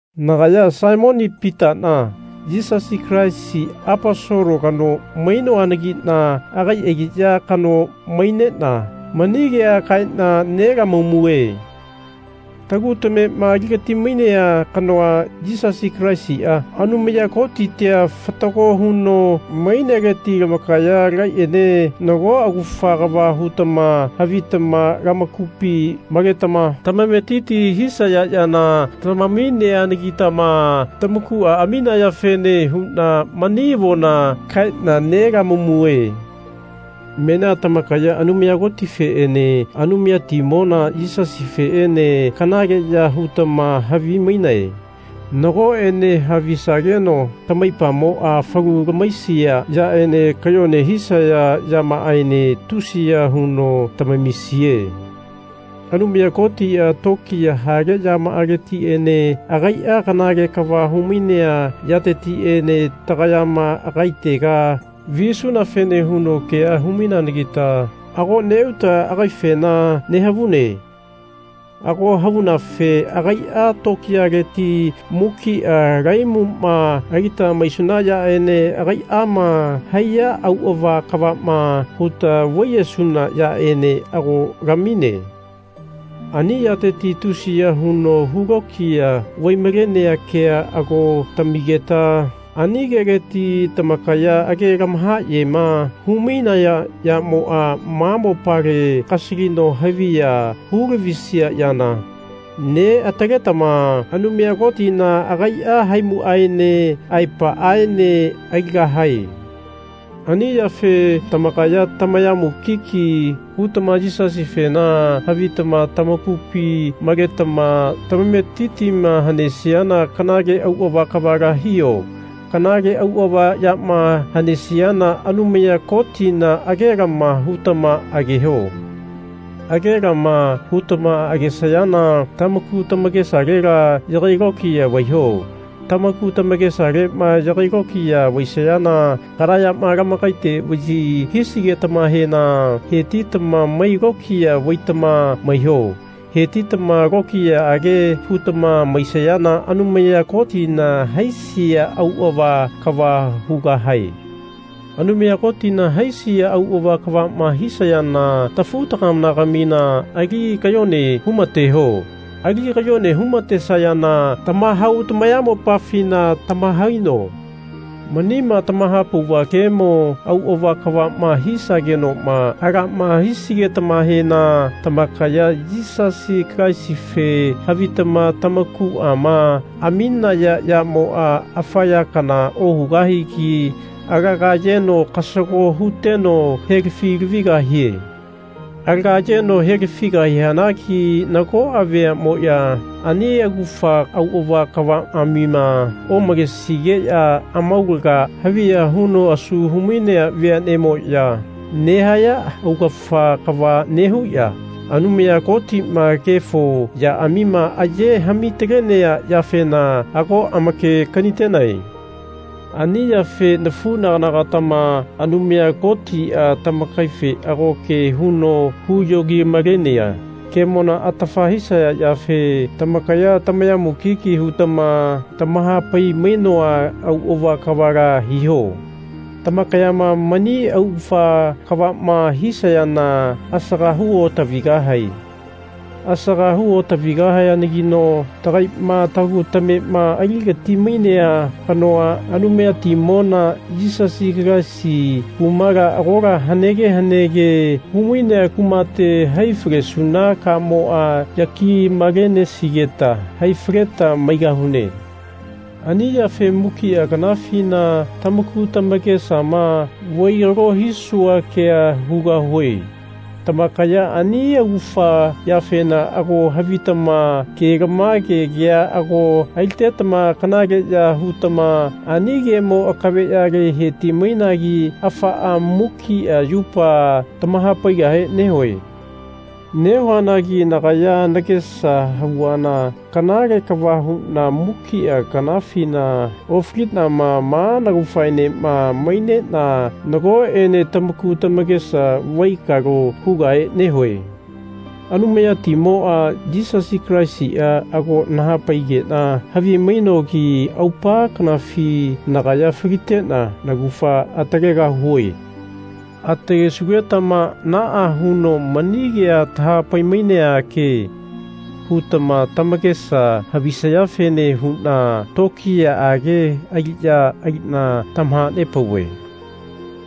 Nagaya Saimoni Pitana Yisasi Kalaisi Aposolo kano mainoanagina agai aliya kano mainena mani kea kaena nelamamue. Tagu tamema aligati-mainea kanoa, Yisasi Kalaisia, Anumaya Kotitia, fatago huno maineleti lamakaya tagaiene nago augafa kava hutama havitama lamakupi maletama tamametiti hisaya yana tamamineanagitama tamakua aminayafene huna mani avona kaena nelamamue. Menia tamakaya Anumaya Kotifeene Anumayatimona Yisasifeene kanaleya hutama havimainae. Nagoene havisageno tamaipamoa falu lamahaisia yaene kayone hisaya yamaaene tusiya huno tamamisie. Anumaya Kotia tokiya hale yamaaletiene agaia kanale kava humainea yatetiene tagayama agaitega visunafene huno kea hu-maineanagita ago neuta agaifena nehavune. Ago havunafe agaia tokiyaleti mukia lahaimuma alita maisuna yaene agaiama haiya auava kavama huta vaiyesuna yaene ago lamine. Ani yateti tusiya huno hu lokiya vai-malenea kea ago tamigeta ani keleti tamakaya age lamahayema hu-mainaya yamoa ma mopale kasalino haviya hu-lavisia yana, neataletama Anumaya Kotina agaia haimuaene aepaaene aligahae. Ani yafe tamakaya tamaya mukiki hutama Yisasifena havitama tamakupi maletama tamametitima hanesiana kanale auava kavala hiho. Kanale auava yama hanesiana Anumaya Kotina agelama hutama ageho. Agelama hutama agesayana tamaku tamakesalela yagai lokiya vaiho. Tamaku tamakesalema yagai lokiya vaisayana kana yama lamakaite vayi hisigetamahena hetitama mai lokiya vaitama maiho. Hetitama lokiyaage hutama maisayana Anumaya Kotina haisia auava kava hugahae. Anumaya Kotina haisia auava kavama hisayana tafu-tagana-gamina ali kayone hu-mateho. Ali kayone hu-matesayana tamahau tamayamopafina tamahaino. Manima tamahapauva kemo auava kavama hisagenoma alama hisigetamahena tamakaya Yisasi Kalaisife havitama tamakuama aminaya yamoa afa ya kana ohugahigi alaga ayeno kasago huteno helafi-lavigahie. Alaga ayeno helafigahianagi nagoa veanemoya ani augafa auava kavaamima omalesigeya amaulaga haviya huno asu humainea veanemoya nehaya augafa kava nehuya Anumaya Kotima kefo yaamima aye hami-talenea yafena ago amake-kanitenae. Ani yafe nafunagana-gatama Anumaya Kotia tamakaife ago ke huno huyogi-malenea kemona atafa hisaya yafe tamakaya tamaya mukiki hutama tamahapai-mainoa auava kavala hiho. Tamakayama mani augafa kavama hisayana asaga hu otavigahae. Asaga hu otavigahayanagino tagaima tagu tamema aligati-mainea kanoa, Anumayatimona Yisasi Kalaisi, kumala agola hanege hanege humainea kumate hai falesuna kamoa yaki-malenesigeta hai faleta maigahune. Ani yafe mukia kanafina tamaku tamakesama vaikalo hisua kea hugahue. Tamakaya ani augafa yafena ago havitama kelamage kea ago alitetama kanaleya hutama ani kemo akaveyale heti-mainagi afaa mukia yupa tamahapaigahe nehue. Nehuanagi nagaya nagesa havuana kanale kava huna mukia kanafina ofalinama ma naugafaenema mainena nagoene tamaku tamakesa vaikalo hugahe nehue. Anumayatimoa Yisasi Kalaisia ago nahapaigena havi-mainogi aupa kanafi nagaya falitena naugafa atalegahue. Atalesugetama Naa huno mani kea tahapai-mainea ke. hutama tamakesa havisayafene huna tokiyaage aliya alina tamahanepauve.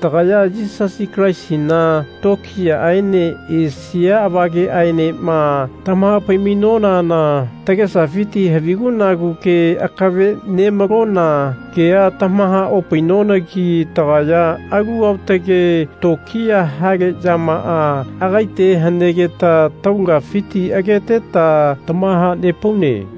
Tagaya Yisasi Kalaisina tokiyaaene esia avageaenema tamahapai-mainonana tagesafiti havigu-nagu ke akave nemalona kea tamaha-opainonagi tagaya alu aotage tokiya hale yamaa agaite hanegeta taulagafiti ageteta tamahanepaune.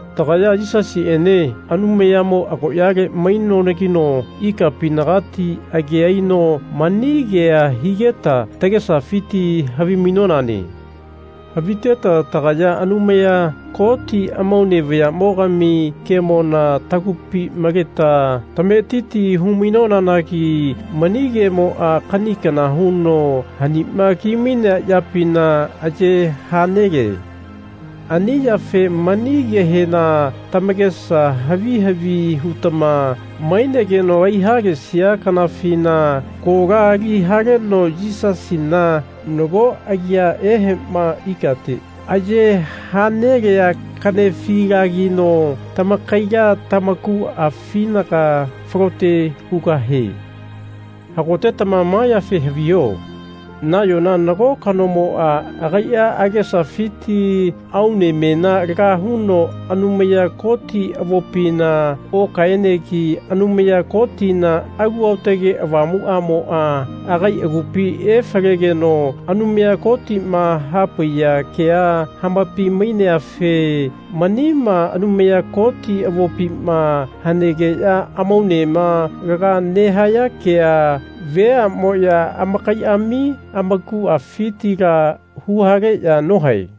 Tagaya Yisasiene Anumayamo agoyale mainonageno ikapinagati age aino mani kea higeta tagesafiti havi-mainone. Haviteta tagaya Anumaya Koti amaune vayamogami kemona tagupi maleta tametiti hu-mainonanagi mani kemoa kani kana huno hanima kimainea yapina aye ha nele. Ani yafe mani kehena tamakesa havi havi hutama mainegeno aiha-lesia kanafina kola ali haleno Yisasina, nago agia ehema ikate aye ha nelea kanefilagino tamakaila tamakuafinaga falote hugahie. Hagotetama ma yafe haviho. Nayona nago kanomoa agaia agesafiti aunemena laga huno Anumaya Koti avopina okaenegi Anumaya Kotina Alu Aotage Avamuamoa agai agupi efalegeno Anumaya Kotima hapaiya kea hamapai-maineafe manima Anumaya Koti avopima hanegeya amaunema laga nehaya kea veamoya amakaiami amakuafitila huhaleya nohae.